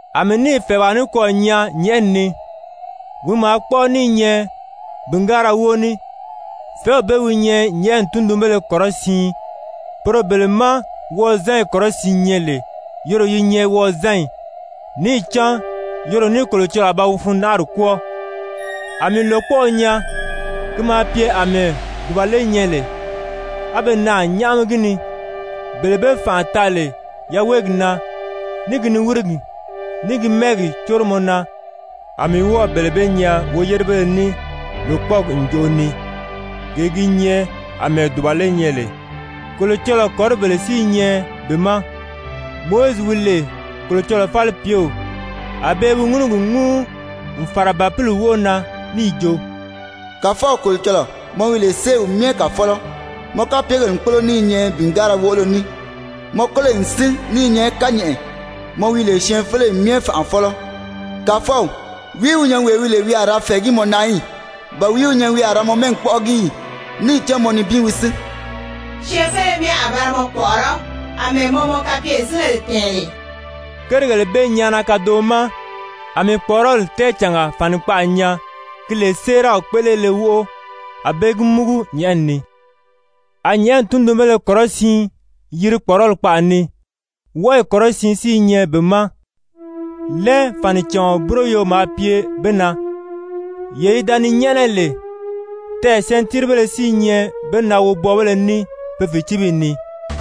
A mii níì fɛ̀ɛwaa nikwɔɔ nyaa nyɛ̀ʔɛni ni, wi maa kpɔ́ʔɔ ní i nyɛ bìngaara wóo ní. Fɛ̀ɛ́w bee wi nyɛ nyɛ̀ʔɛni tundunbéle kɔrɔsiin, poro bele má wɔʔɔzanyi kɔrɔsiin nyɛ lè, yoro yi nyɛ wozanyi, níì cán yoro ní Kolocɔlɔɔ a ba wi fundanʔari kwɔ́ɔ. A mii lòkpɔʔɔ nyaa, ki maa pye àmɛɛ dùbale nyɛ lè, á be naà nyáʔami gi ni, bele be fànʔa taa lè yaweegi na, ní gi niwirigi, ní gi mɛ́ɛgi córomɔ na, a mii wɔ́ɔ̀ bele bee nyaa woyérebéle ní lòkpɔɔgi ǹjoʔo ni, gee gi nyɛ àmɛɛ dùbale nyɛ lè. Kolocɔlɔɔ kɔ̀ríbèle si i nyɛ be ma. Mowizi wi lè Kolocɔlɔɔ falipyew, a be i wi ŋúnugi ŋúu n fàra Bàpili wóʔo na, níì jo: «Kàfɔw Kolocɔlɔɔ, mɔ wi lè Séew Myɛ Kàfɔlɔ, mɔ kapyegèle n kpólo ní i nyɛ bìngaara woʔolo ní! Mɔ kóloyi n sín ní i nyɛ kányɛʔɛ, mɔ wi lè syɛɛnfeleyi myɛ Fànʔafɔlɔ! Kàfɔw, wìí wi nyɛ wee wi lè wi a ra fɛ̀ɛgí mɔ na í? Ba wìí wi nyɛ wi a ra mɔ mɛ́ɛgi kpɔ́ʔɔgi í? Níì cán mɔ nibin wi sín. Syɛɛnfeleyi myɛ a ba ra mɔ kpɔ̀ʔɔrɔ́, àmɛɛ mɔ mɔ kapyezingèle tɛ̀ɛn lè.» Kérigèle bee nyaana kadoʔo ma, a mii kpɔ̀ʔɔrɔli tɛɛcànga fànikpaʔa nyaa ki lè séeraw kpéʔelele wóʔo, a be gi múgu nyɛ̀ʔɛni ni. A nyɛ̀ʔɛni tundunbéle kɔrɔsiin yiri kpɔ̀ʔɔrɔli kpaʔa ni, wɔʔɔyi kɔrɔsiin si i nyɛ be ma. Lɛn fànicàɔn búroyo maa pye be na, yee yi da ni nyɛ́ʔɛnɛ lè, tɛɛ̀ sɛntiiribéle si i nyɛ be na wobwɔɔbéle ní pe fìcibiyi ni.